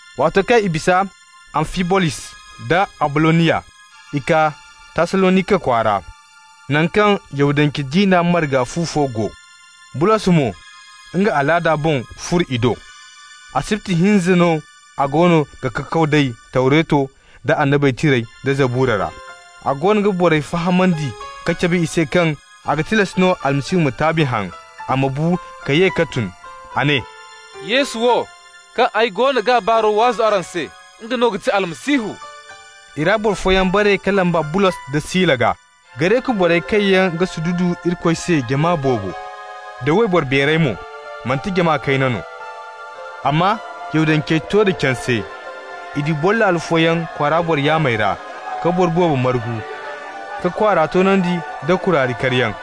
Waato kaŋ i bisa Amfibolis da Aboloniya, i kaa Tassalonika kwaara, naŋ kaŋ Yahudance diina marga fu fo go. Bulos mo nga alaada boŋ furo i do. Asibti hinza no a goono ga kakaw nd'ey Tawreto da Annabey Tirey da Zabura ra. A goono ga borey fahamandi ka cabe i se kaŋ a ga tilas no Almasihu ma taabi haŋ, a ma bu ka ye ka tun. A ne: «Yesu wo, kaŋ ay goono g'a baaro waazu araŋ se, nga no ga ti Almasihu.» I ra boro fooyaŋ bare ka lamba Bulos da Sila gaa. Gareku borey kaŋ yaŋ ga sududu Irikoy se jama boobo, da wayboro beerey mo, manti jama kayna no. Amma Yahudancey to da canse. I du boro laalo fooyaŋ kwaara boro yaamey ra, ka boro boobo margu, ka kwaara toonandi nda kuraari karyaŋ.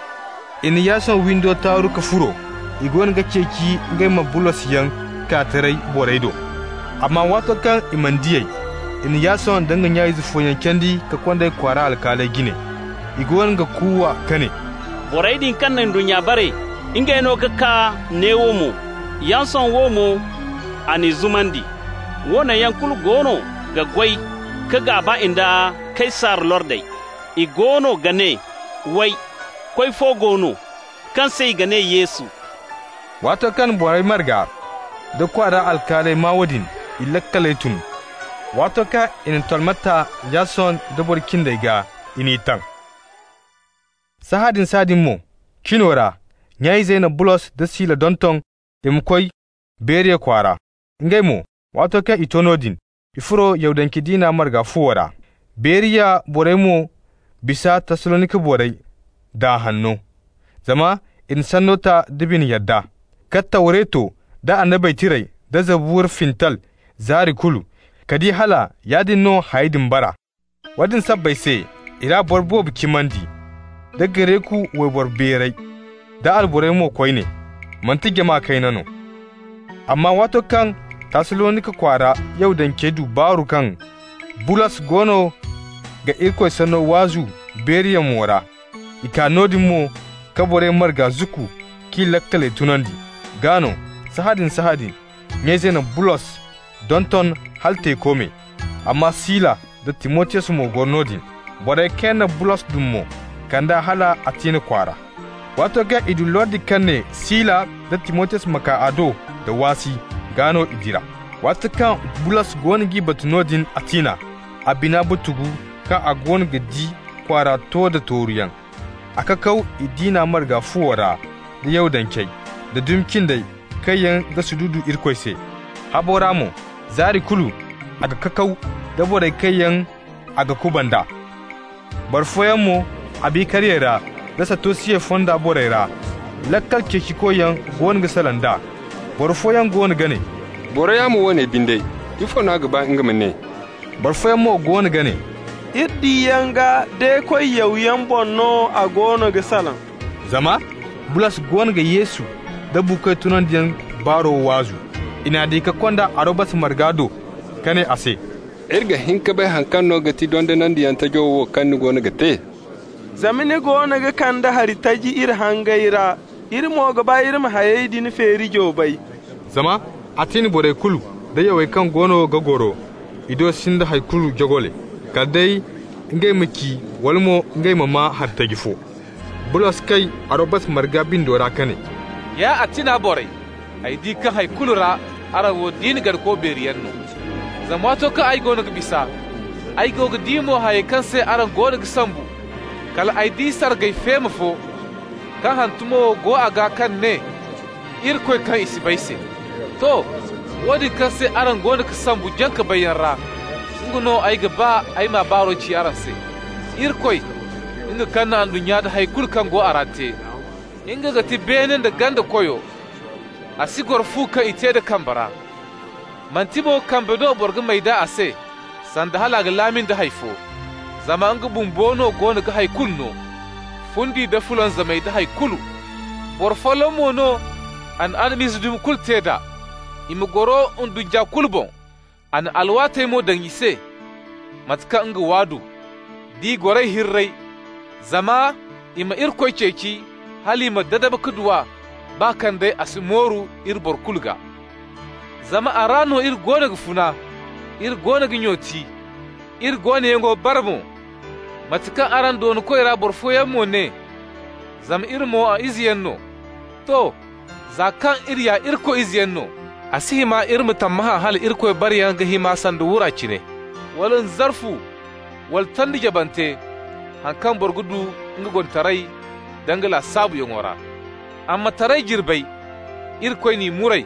I na Yason windo taaru ka furo. I goono ga ceeci ngey ma Bulosyaŋ kaa taray borey do. Amma waato kaŋ i mana di ey, i na Yason da nya-izey fooyaŋ candi ka kond'ey kwaara alkaaley jine. I goono ga kuuwa ka ne: «Borey din kaŋ na ndunnya bare, ngey no ka kaa neewo mo. Yason wo mo, a n'i zumandi. Woone yaŋ kulu goono ga goy ka gaaba nda Kaysar lordey. I goono ga ne, way, koy fo go no, kaŋ se i ga ne Yesu.» Waato kaŋ borey marga da kwaara alkaaley maa woodin, i laakaley tun. Waato kaŋ i na tolme ta Yason da boro cindey gaa, i n'i taŋ. Sahãadin-sahãadin mo, cino ra, nya-izey na Bulos da Sila donton i ma koy Beriya kwaara. Ngey mo, waato kaŋ i to noodin, i furo Yahudance diina marga fuwo ra. Beriya borey mo bisa Tassalonika borey daa hanno, zama i na sanno ta da bine yadda, ka Tawreto da Annabey Tirey da Zabura fintal zaari kulu, ka di hala yaadin no hayey din bara. Woodin sabbay se i ra boro boobo cimandi, da Gareku wayboro beerey da alborey mo koyne, manti jama kayna no. Amma waato kaŋ Tassalonika kwaara Yahudancey du baaru kaŋ Bulos goono ga Irikoy sanno waazu Beriya mo ra, i kaa noodin mo ka borey marga zukku k'i laakaley tunandi. Gaa no, sahãadin-sahãadin nya-izey na Bulos donton hala teeko me, amma Sila da Timotiyos mo goro noodin. Borey kaŋ yaŋ na Bulos dum mo kand'a hal Atina kwaara. Waato kaŋ i du lordi kaŋ ne Sila da Timotiyos ma kaa a do da waasi, gaa no i dira. Waato kaŋ Bulos goono g'i batu noodin Atina, a bina butugu kaŋ a goono ga di kwaara to da tooruyaŋ. A kakaw i diina marga fuwo ra da Yahudancey, da dumi cindey kaŋ yaŋ ga sududu Irikoy se. Habo ra mo zaari kulu a ga kakaw da borey kaŋ yaŋ a ga kubanda. Boro fooyaŋ mo, Abikariyey ra da Satosiyey fonda borey ra, laakal ceecikoyaŋ, goono ga salaŋ d'a. Boro fooyaŋ goono ga ne: «Boro yaamo woone binde, ifo n'a ga ba nga ma ne?» Boro fooyaŋ mo goono ga ne: «Iri diyaŋ gaa de-koy yawyaŋ boŋ no a goono ga salaŋ» (zama Bulos goono ga Yesu nda buukoy tunandiyaŋ baaro waazu). I n'a di ka kond'a Arobasa marga do ka ne a se: «Iri ga hin ka bay haŋ kaŋ no ga ti dondonandiyaŋ tajo wo, kaŋ ni goono ga te? Zama ni goono ga kande hari taji iri hangey ra. Iri mo ga ba iri ma hayey din feerijo bay.» Zama Atina borey kulu da yawey kaŋ goono ga goro i do sinda hay kulu joogole, kala day ngey ma ci wala mo ngey ma maa hari taji fo. Bulos kay Arobasa marga bindo ra ka ne: «Ya Atina borey, ay di kaŋ hay kulu ra araŋ wo diina ganako beeriyaŋ no. Zama waato kaŋ ay goono ga bisa, ay go ga di mo hayey kaŋ se araŋ goono ga sombu, kal ay di sargay feema fo kaŋ hantumo wo go a gaa kaŋ ga ne: IRIKOY KA} I SI BAY SE. To! Woodin kaŋ se araŋ goono ga sombu jaŋ-ka-bayyaŋ ra, nga no ay ga ba ay m'a baaro ci araŋ se. Irikoy, nga kaŋ na ndunnya nda hay kulu kaŋ go a ra te, nga ga ti beene nda ganda Koyo. A si goro fu kaŋ i te da kambe ra. Manti mo kambe no boro ga may d'a a se, sanda hal a ga laami hay fo, zama nga bumbo no goono ga hay kulu no: fundi da fulanzamay da hay kulu. Boro folloŋ mo no a na Adam-izey dumi kulu te d'a, i ma goro ndunnya kulu boŋ. A na alwaatey mo daŋ i se mate kaŋ nga waadu, d'i goray hirrey, zama i ma Irikoy ceeci hal i ma dadab ka du a, baa day kaŋ a si mooru iri boro kulu gaa. Zama a ra no iri goono ga funa, iri goono ga nyooti, iri goonoyaŋo bara mo, mate kaŋ araŋ doonkoy ra boro fooyaŋ mo ne: ‹Zama iri mo a izeyaŋ no.› To! Za kaŋ iri ya Irikoy izeyaŋ no, a si hima iri ma tammahã hala Irikoy barayaŋ ga hima sanda wura cine, wala nzarfu, wala tondi jabante, haŋ kaŋ boro ga du nga gonitaray da nga lasaabuyaŋo ra. Ammataray jirbey, Irikoy n'i muray,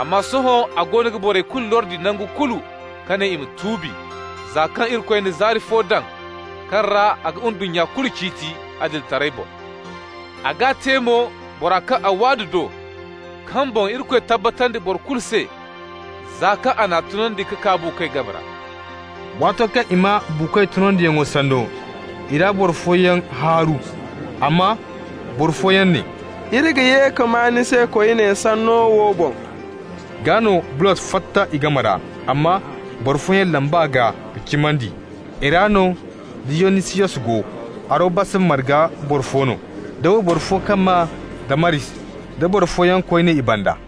amma sohõ a goono ga borey kulu lordi nangu kulu ka ne i ma tuubi, za kaŋ Irikoy na zaari fo daŋ kaŋ ra a ga ndunnya kulu ciiti adilitaray boŋ. A g'a te mo bora kaŋ a waadu do, kaŋ boŋ Irikoy tabbatandi boro kulu se za kaŋ a n'a tunandi ka kaa buukoy game ra.» Waato kaŋ i maa buukoy tunandiyaŋo sanno, i ra boro fooyaŋ haaru. Amma boro fooyaŋ ne: «Iri ga ye ka maa ni se koyne sanno wo boŋ.» Gaa no Bulos fatta i game ra. Amma boro fooyaŋ lamb'a gaa ka cimandi. I ra no Diyonisiyos go, Arobasa marga boro fo no, da wayboro fo kaŋ maa Damaris, da boro fooyaŋ koyne i banda.